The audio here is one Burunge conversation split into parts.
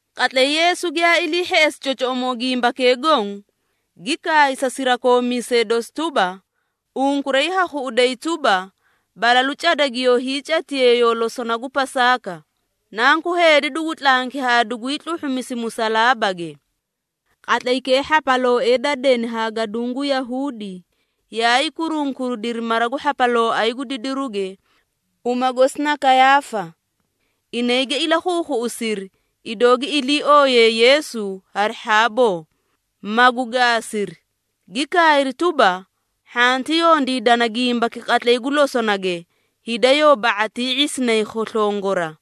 Qatlay Yeesu giyaa ilii hheꞌesi cocoꞌomoo gimbakee goõ, gi kaay sa sirakoomiisee dosi tuba, “Unkuray ha khuꞌuday tuba, balalu cada giyoo hiicatiyee yoo losona gu Pasaaka. Nanku Heedi dugu tlanki haa dugwii tluhhumisi musalaabage.” Qatlaykee hhapalooee da deni haa gaduũ gu Yahuudi, yaay kurunkuridiri mara gu hhapalooay gu didiruge, uma gosi na Kayaafa. Inay gi ilakhuukhuꞌusiri, idoo gi ilii ooyiyee Yeesu hari hhaaboo, magu gaasiri. Gi kaayri tuba, “Hhanti yondiidana gimbaki qatlay gu losonage, hida yoo ba⁄atii ⁄isinay khoslongora.”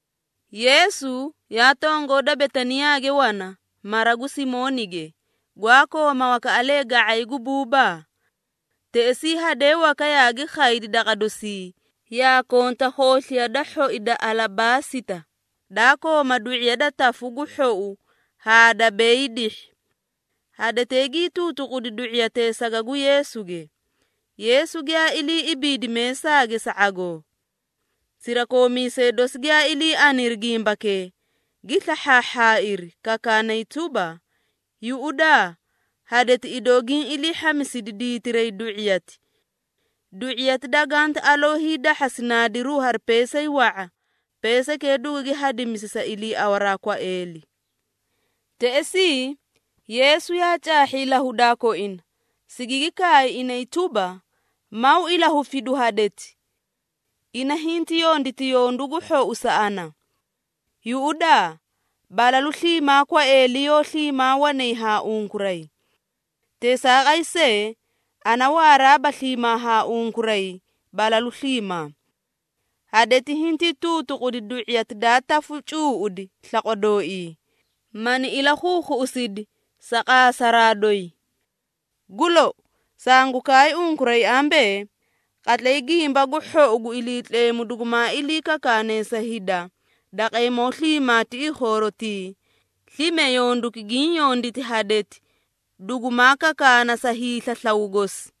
Yeesu yaa tongoo da Betaniyaage wana, mara gu Simoonige, gwaa kooma wakaꞌalee ga⁄ay gu buubaa. Teꞌesii hadee waka yaagi khaydi daqa dosii, yaa konta khoosliya da hhoi da alabaasita, daa kooma du⁄iya da tafu gu hhou haa da beyii dihhi. Hadetee gii tuutuqudi du⁄iyatee saga gu Yeesuge, Yeesu giyaa ilii ibiidi meesaage sa ⁄agoo. Sirakoomiisee dosi giyaa ilii aniri gimbakee, gi slahhaahhaairi, kakaanay tuba, “Yuꞌudaa hadeti idoo giĩ ilii hhamisidi diitiray du⁄iyati. Du⁄iyati danganti aloo hiidahhasi naadiru hari peesay wa⁄a, peesaykee dugugi hadimisi sa iliiawaraa kwaeeli.” Teꞌesii, Yeesu yaa caahhi ilahudaa koina, sigigi kaay inay tuba, “Maw ilahufidu hadeti! Ina hinti yonditi yondu gu hhou sa ana. Yuꞌudaa, balalu sliimaa kwaeeli yoó sliimaa wanay haa unkuray. Teesaaqay see, ana waaraaba sliimaa haa unkuray balalu sliimaa. Hadeti hintii tuutuqudi du⁄iyati daa tafu cuuꞌudi slaqwa dooii, mani ilakhuukhuꞌusidi sa qaasaraa doyi. Gu lou, sangu kaay unkuray ambee, qatlay Gimba gu Hhou gu Iliitleemu dugumaa ilii kakaane sa hida daqeemoo sliimaa tiꞌii khoorotii, slime yonduki giĩ yonditi hadeti, dugumaa kakaana sa hiislaslaw gosi.”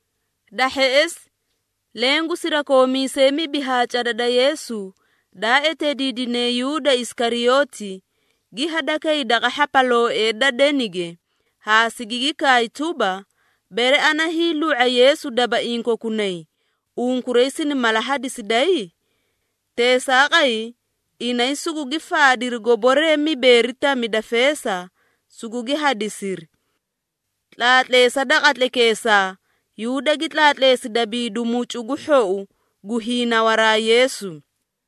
Da hheꞌesi, leẽ gu sirakoomiisee mibi haa cada da Yeesu, daa eteediidine Yuuda Isikariyooti, gi hadakay daqa hhapalooee da denige, haa sigigi kaay tuba, “Bere ana hiilu⁄a Yeesu dabaiĩ kokunay, unkuray sini mala hadisiday?” Teesaaqay inay sugugi faadiri goboree mibeeri tami da feesa, sugugi hadisiri. Tlaatleesa da qatlaykeesaa, Yuuda gi tlaatleesi dabiidi mucu gu hhou gu hiinawaraa Yeesu.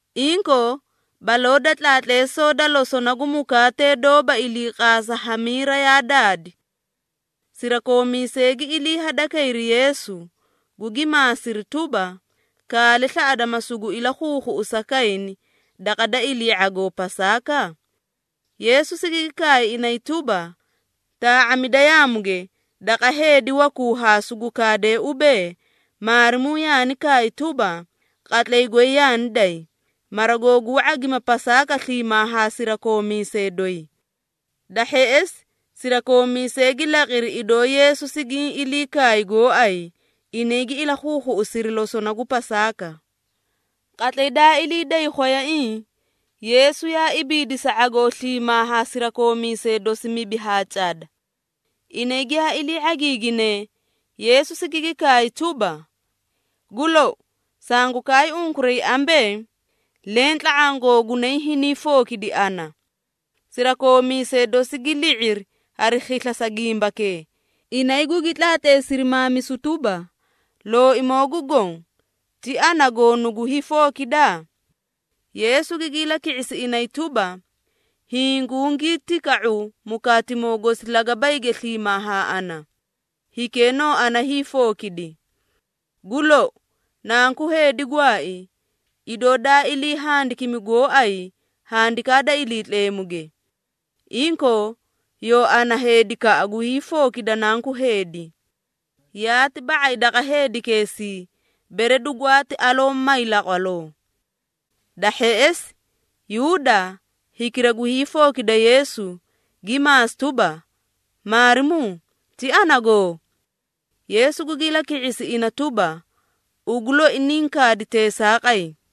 Inkoo, baloo da tlaatleesoo da losona gu mukaatee doóba iliiqaasa hamiira yaa daadi. Sirakoomiisee gi ilii hadakayri Yeesu, gugi maasiri tuba, “Kaale slaꞌada ma sugu ilakhuukhuꞌusa kayni daqa da ilii ⁄agoo Pasaaka?” Yeesu sigigi kaay inay tuba, “Taa⁄amida yaamuge daqa heedi wakuu haa sugu kaadee ubee, ‘Maarimuu yaani kaay tuba, qatlay goy yaani day, mara googuu ⁄agima Pasaaka sliimaa haa sirakoomiisee doyi.’” Da hheꞌesi, sirakoomiisee gi laqiri, idoo Yeesu sigaani ilii kaay gooay, inay gi ilakhuukhuꞌusiri losona gu Pasaaka. Qatlay daa ilii day khwayaiĩ, Yeesu yaa ibiidi sa ⁄agoo sliimaa ha sirakoomiisee dosi mibi haa cada. Inay giyaa ilii ⁄agiiginee, Yeesu sigigi kaay tuba, “Gu lou, sangu kaay unkuray ambee, leẽ tla⁄aã googunay hiniĩ fookidi ana.” Sirakoomiisee dosi gi li⁄iri hari khisla sa gimbakee, inay gugi tlaatleesiri maamisu tuba, “Looimoo gu Goõ, ti ana goo nugu hiifookida?” Yeesu gigi ilaki⁄isi inay tuba, “Hiĩ gungii tika⁄u mukaatimoo gosi lagabayge sliimaa haa ana, hikee noo ana hiifookidi. Gu lou, Nanku Heedi gwaai, idoo daa ilii handikimi gooay Handikaa da Iliitleemuge. Inkoo, yoo ana heedikaꞌa gu hiifookida Nanku Heedi! Yaati ba⁄ay daqa heedikeesii, bere dugwaati aloo may laqwaloo.” Da hheꞌesi, Yuuda, hikira gu hiifookida Yeesu, gi maasi tuba, “Maarimuu, ti anagoo?” Yeesu gugi ilaki⁄isi ina tuba, “Ugu loi niĩ kaadi teesaaqay.”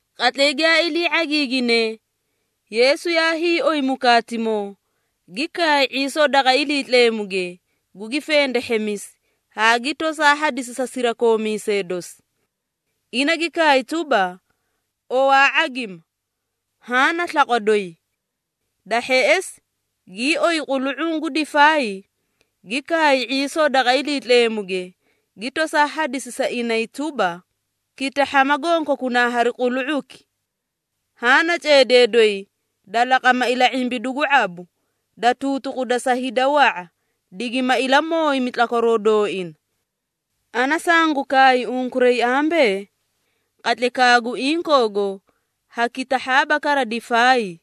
Qatlay giyaa ilii ⁄agiiginee, Yeesu yaa hiioy mukaatimoo, gi kaay ⁄iisoo daqa Iliitleemuge, gugi fendehhemisi, haa gi tosaa hadisi sa sirakoomiisee dosi. Ina gi kaay tuba, “Owaa ⁄agima, haã na slaqwa doyi.” Da hheꞌesi, gii oyi qulu⁄uu gu difaay, gi kaay ⁄iisoo daqa Iliitleemuge, gi tosaa hadisi sa inay tuba, “Kitahhama gonkokunaa hari qulu⁄uki. Haã na ceedee doyi da laqama ila⁄imbidu gu ⁄abu, da tuutuquda sa hida wa⁄a, digima ilamooyimi tlakwaroo dooina. Ana sangu kaay unkuray ambee, qatlaykaa gu inkoogo ha kitahhaaba kara difaay,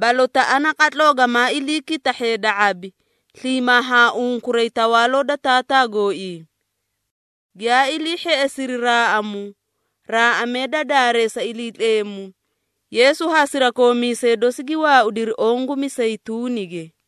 balotaꞌa naqatloo gamaa iliikitahhe da ⁄abi, sliimaa haa unkuray Tawaaloo da Taataa gooii.” Giyaa ilii hheꞌesiri raaꞌamu, raaꞌamee da daareesa Iliitleemu, Yeesu haa sirakoomiisee dosi gi waaudiri oõ gu Miseyituunige.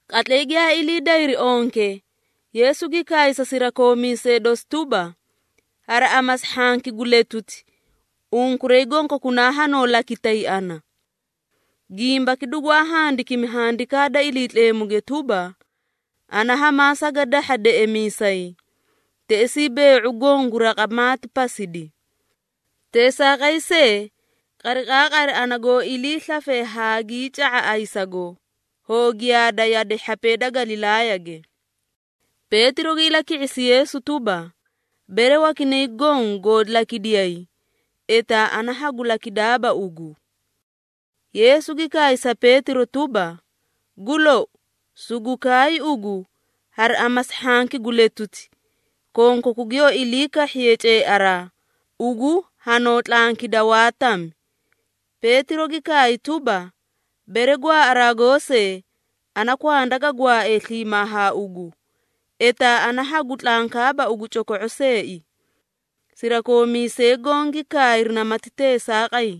Qatlay giyaa ilii dayri onke, Yeesu gi kaay sa sirakoomiisee dosi tuba, “Hari amasi hhanki gu letuti, unkuray gonkokunaa hanoo lakitay ana. Gimbaki dugwaa handikimi Handikaa da Iliitleemuge tuba, ‘Ana hamaa sagadahha deꞌemiisay, teꞌesii bee⁄u goõ gu raqa maati pasidi.’ Teesaaqay see, qariqaaqari ana goo iliislafe haagii ca⁄a ayisago, hoo giyaada yade hhapee da Galilaayage.” Peetiro gi ilaki⁄isi Yeesu tuba, “Bere wakinay goõ goo lakidiyay, etaa ana hagu lakidaaba ugu.” Yeesu gi kaay sa Peetiro tuba, “Gu lou, sugu kaay ugu, hari amasi hhanki gu letuti, konkaku giyoo ilii kahhiye ceearaa, ugu hanoo tlankida waa tami.” Peetiro gi kaay tuba, “Bere gwaaꞌaraa goosee, ana kwanda ga gwaae sliimaa haa ugu, etaa ana hagu tlankaaba ugu coko⁄o seei.” Sirakoomiisee goõ gi kaayri namati teesaaqay.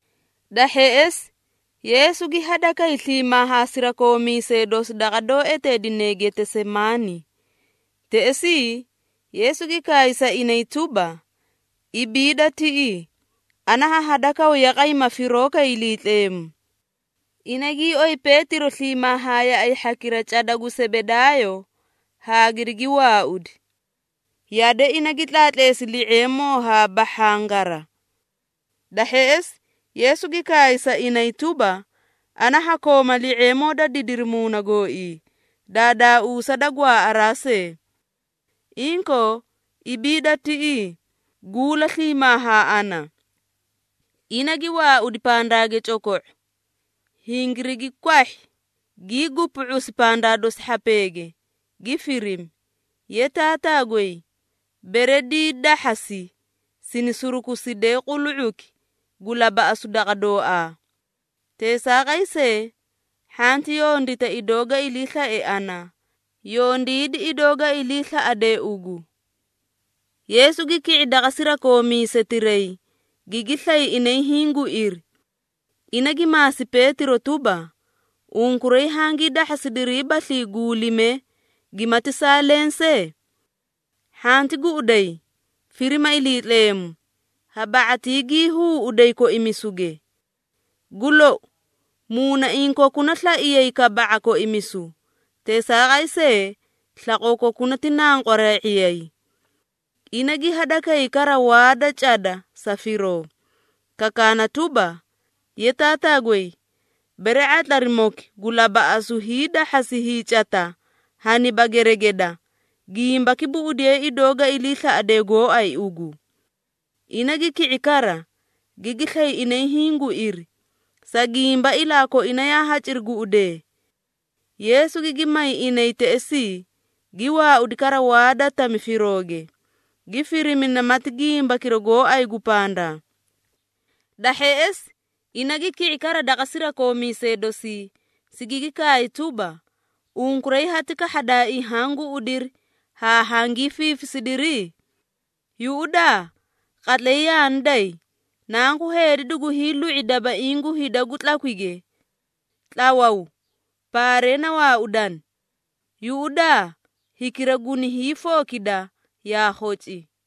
Da hheꞌesi, Yeesu gi hadakay sliimaa haa sirakoomiisee dosi daqa doó eteedine Getesemaani. Teꞌesii, Yeesu gi kaay sa inay tuba, “Ibiida tiꞌii, ana ha hadakaw yaqay ma firoo kay Iliitleemu.” Ina gii oyi Peetiro sliimaa haa yaꞌay hhakira cada gu Sebedaayo haa girigi waaudi. Yade ina gi tlaatleesi li⁄eemoo haa bahhangara. Da hheꞌesi, Yeesu gi kaay sa inay tuba, “Ana ha kooma li⁄eemoo da didiri muuna gooii, daadaauusa da gwaaꞌaraa see. Inkoo ibiida tiꞌii, guula sliimaa haa ana.” Ina gi waaudi pandaage coko⁄o, hingirigi kwahhi gii gupu⁄usi pandaa dosi hhapeege, gi firimi, “Ye Taataa goy, bere diidahhasi, sini surukuside qulu⁄uki gu labaꞌasu daqa dooaa. Teesaaqay see, hhanti yondita idoo ga iliislae ana, yondiidi idoo ga iliislaꞌade ugu.” Yeesu gi ki⁄i daqa sirakoomiisetiray, gigi slay inay hiĩ guiri. Ina gi maasi Peetiro tuba, “Unkuray hangii dahhasidiriibaslii guulimee, gimati saa leẽ see? Hhanti guꞌuday, firima Iliitleemu, ha ba⁄atii gii huuꞌuday koimisuge. Gu lou, muunaiĩ kokuna slaiyay kaba⁄a koimisu, teesaaqay see, slaqoo kokuna ti nanqweree⁄iyay.” Ina gi hadakay kara waa da cada sa firoo, kakaana tuba, “Ye Taataa goy, bere ⁄atlarimoki gu labaꞌasu hiidahhasi hiicata haniba geregeda, gimbaki buꞌudiye idoo ga iliislaꞌade gooay ugu.” Ina gi ki⁄i kara, gigi slay inay hiĩ guiri, sa gimba ilaa koina yaa haciri guꞌudee. Yeesu gigi may inay teꞌesii, gi waaudi kara waa da tami firooge, gi firimi namati gimbakira gooay gu pandaa. Da hheꞌesi, ina gi ki⁄i kara daqa sirakoomiisee dosii, sigigi kaay tuba, “Unkuray hati kahhadaaii haã guꞌudiri, haa hangii fiifisidiri? Yuꞌudaa qatlay yaani day, Nanku Heedi dugu hiilu⁄i dabaiĩ gu hida gu tlakwige. Tlawaw, paaree na waaudani! Yuꞌudaa, hikira guni hiifookida, yaa khoci!”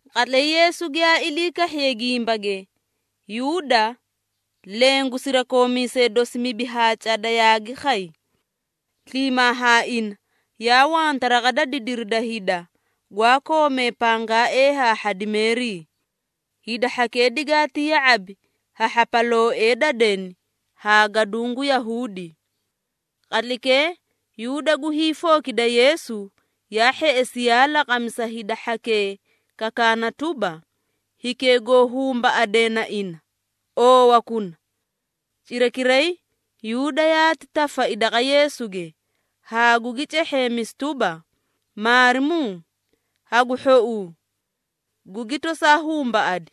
Qatlay Yeesu giyaa ilii kahhiye gimbage, Yuuda, leẽ gu sirakoomiisee dosi mibi haa cada yaagi khay. Sliimaa haa ina yaa wanta raqa da didiri da hida, gwaa koomee pangaaee haa hhadimeerii. Hida hhakee digaati ya⁄abi ha hhapalooee da deni haa gaduũ gu Yahuudi. Qatlaykee, Yuuda gu hiifookida Yeesu, yaa hheꞌesi yaa laqami sa hida hhakee kakaana tuba, “Hikee goo humbaꞌade na ina, oowakuna.” Cirakiray, Yuuda yaati tafai daqa Yeesuge, haa gugi cehheemisi tuba, “Maarimuu, hagu hhouu!” Gugi tosaa humbaꞌadi.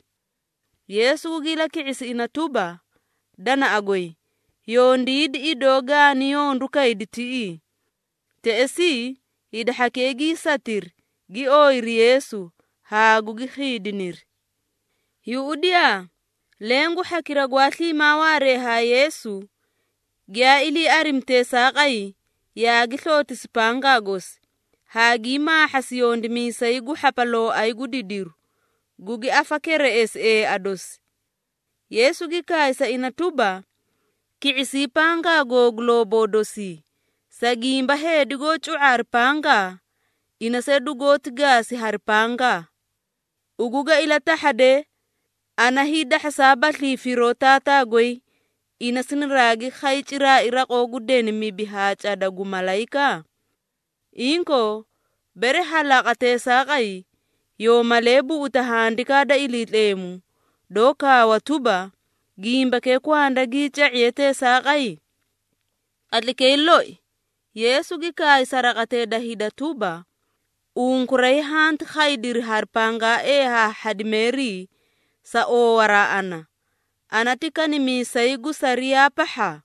Yeesu gugi ilaki⁄isi ina tuba, “Danaꞌa goy, yondiidi idoo gaani yondu kaydi tiꞌii.” Teꞌesii, hida hhakee gii satiri, gi ooyiri Yeesu, haa gugi khiidiniri. Yuꞌudiyaa, leẽ gu hhakira gwaa sliimaa waaree haa Yeesu, giyaa ilii arimi teesaaqay, yaagi slootisi pangaa gosi, haa gii maahhasi yondimiisay gu hhapalooay gu didiru, gugi afakereꞌesi eea dosi. Yeesu gi kaay sa ina tuba, “Ki⁄isii pangaa googu looboo dosii, sa gimba heedi goó cu⁄a hari pangaa, ina see dugooti gaasi hari pangaa. Ugu ga ilatahhade, ana hiidahhasaabaslii firoo Taataa goy, ina sinaraagi khay ciraai raqoo gu deni mibi haa cada gu malayika? Inkoo, bere ha laqa teesaaqay, yoo malee buꞌuta Handikaa da Iliitleemu, doó kaawa tuba, gimbakee kwanda gii ca⁄iye teesaaqay?” Qatlaykee loi, Yeesu gi kaay sa raqatee da hida tuba, “Unkuray hanti khaydiri hari pangaaee haa hhadimeerii, sa oowaraa ana, ana ti kanimiisay gu sariyaa pahha?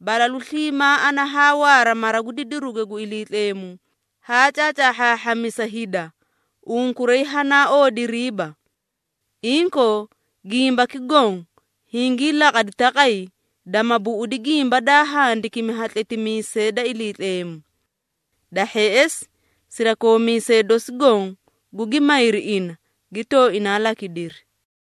Balalu sliimaa ana haa waara mara gu didiruge gu Iliitleemu, haa caacaahhaahhamisa hida, unkuray hanaa oodiriiba. Inkoo, gimbaki goõ hingii laqadi taqay, dama buꞌudi gimba daa handikimi ha tletimiisee da Iliitleemu.” Da hheꞌesi, sirakoomiisee dosi goõ gugi mayri ina, gi tooinaa lakidiri.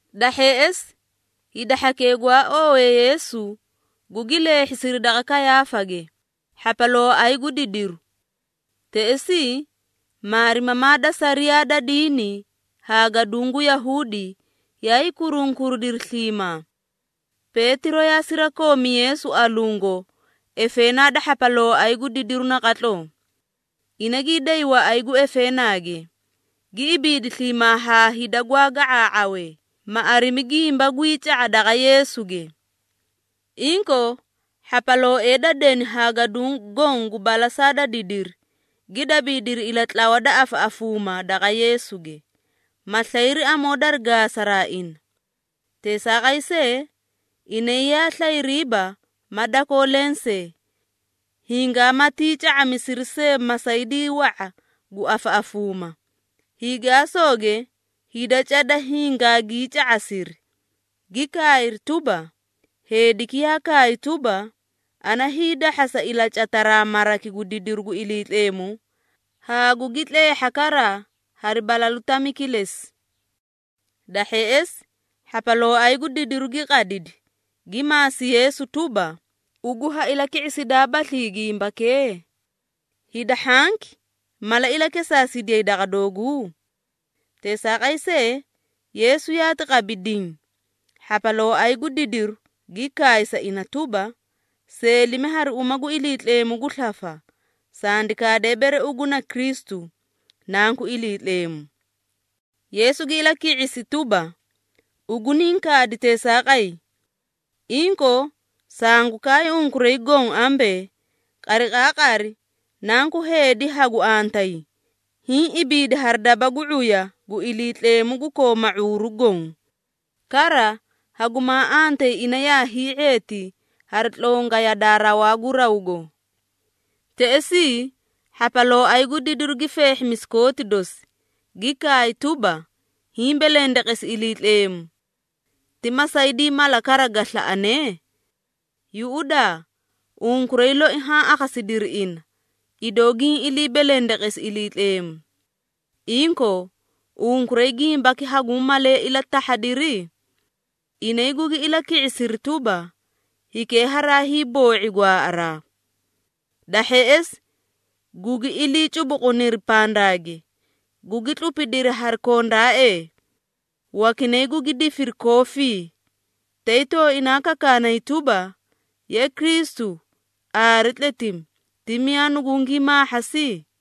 Da hheꞌesi, hida hhakee gwaa oowee Yeesu, gugi leehhisiri daqa Kayaafage, hhapalooay gu didiru. Teꞌesii, maarimamaa da sariyaa da diini haa gaduũ gu Yahuudi yaay kurunkuridiri sliimaa. Peetiro yaa sirakoomi Yeesu alungo efeenaa da hhapalooay gu didiru naqatloo. Ina gii day waꞌay gu efeenaage, gi ibiidi sliimaa haa hida gwaa ga⁄aa⁄awee, ma arimi gimba gwii ca⁄a daqa Yeesuge. Inkoo, hhapalooee da deni haa gaduũ goõ gu balasaa da didiri, gi dabiidiri ilatlawa da afaꞌafuuma daqa Yeesuge, ma slayri amoo dari gaasaraa ina. Teesaaqay see, inay yaa slayriiba ma dakoo lensee, hingamatii ca⁄amisiri see masaydii wa⁄a gu afaꞌafuuma. Hiigaasooge hida cada hingaagii ca⁄asiri, gi kaayri tuba, “Heediki yaa kaay tuba, ‘Ana hiidahhasa ilacataraa maraki gu didiru gu Iliitleemu, haa gugi tleehha kara hari balalu tami kilesi.’” Da hheꞌesi, hhapalooay gu didiru gi qadidi, gi maasi Yeesu tuba, “Ugu ha ilaki⁄isidaabaslii gimbakee? Hida hhanki mala ilakesaasidiyay daqa dooguu?” Teesaaqay see, Yeesu yaati qabi diĩ. Hhapalooay gu didiru gi kaay sa ina tuba, “Seelimi hari uma gu Iliitleemu gu slafa, sandi kaade bere ugu na Kristu, Nanku Iliitleemu.” Yeesu gi ilaki⁄isi tuba, “Ugu niĩ kaadi teesaaqay. Inkoo, sangu kaay unkuray goõ ambee, qariqaaqari, Nanku Heedi hagu antayi, hiĩ ibiidi hari daba gu ⁄uya gu Iliitleemu gu kooma ⁄uuru goõ. Kara, hagumaa antayi ina yaa hii⁄eeti hari tlonga yadaa rawaa gu rawgo.” Teꞌesii, hhapalooay gu didiru gi feehhimisi kooti dosi, gi kaay tuba, “Hiĩ belendeqesi Iliitleemu! Ti masaydii mala kara ga slaꞌane? Yuꞌudaa unkuray loi haã akhasidiri ina, idoo giĩ ilii belendeqesi Iliitleemu. Inkoo, unkuray gimbaki haguũ malee ilatahhadiri?” Inay gugi ilaki⁄isiri tuba, “Hikee haraay boo⁄i gwaaꞌaraa!” Da hheꞌesi, gugi ilii cubuquniri pandaage, gugi tlupidiri hari kondaaee. Wakinay gugi difiri koofii, tay tooinaa kakaanay tuba, “Ye Kristu, aare tletimi, ti miyaa nugungii maahhasi?”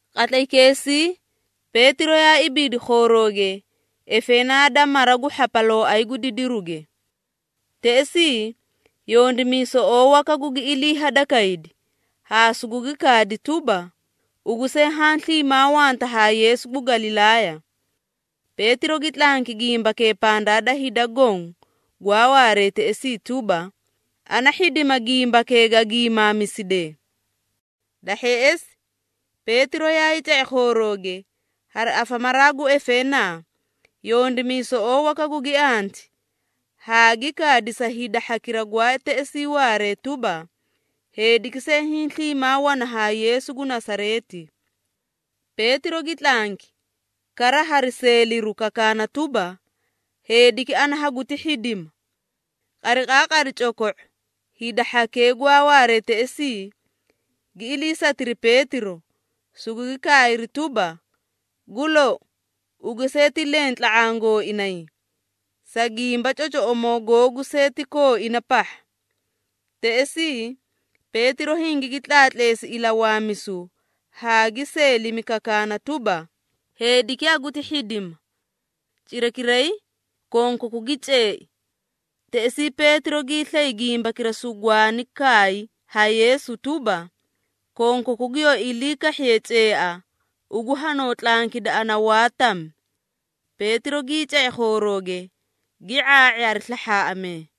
Qatlaykeesii, Peetiro yaa ibiidi khoorooge efeenaa da mara gu hhapalooay gu didiruge. Teꞌesii, yondimiisoꞌoo waka gugi ilii hadakaydi, haa sugugi kaadi tuba, “Ugu see haã sliimaa wanta haa Yeesu gu Galilaaya.” Peetiro gi tlanki gimbakee pandaa da hida goõ gwaa waaree teꞌesii tuba, “Ana hhidima gimbakee gaa giimaamiside.” Da hheꞌesi, Peetiro yaay ca⁄i khoorooge, hari afamaraa gu efeenaa, yondimiisoꞌoo waka gugi anti, haa gi kaadi sa hida hhakira gwaa teꞌesii waaree tuba, “Heediki see hiĩ sliimaa wana haa Yeesu gu Nasareeti.” Peetiro gi tlanki, kara hari seeliru kakaana tuba, “Heediki ana haguti hhidima!” Qariqaaqari coko⁄o, hida hhakee gwaa waaree teꞌesii, gi iliisatiri Peetiro, sugugi kaayri tuba, “Gu lou, ugu see ti leẽ tla⁄aã gooinay, sa gimba cocoꞌomoo googu see ti kooina pahha.” Teꞌesii, Peetiro hingigi tlaatleesi ilawaamisu haa gi seelimi kakaana tuba, “Heediki haguti hhidima!” Cirakiray, konkaku gi ceei. Teꞌesii, Peetiro giislay gimbakira sugwaani kaay ha Yeesu tuba, “Konkaku giyoo ilii kahhiye ceea, ugu hanoo tlankida ana waa tami.” Peetiro gii ca⁄i khoorooge, gi ⁄aa⁄i hari slahhaaꞌamee.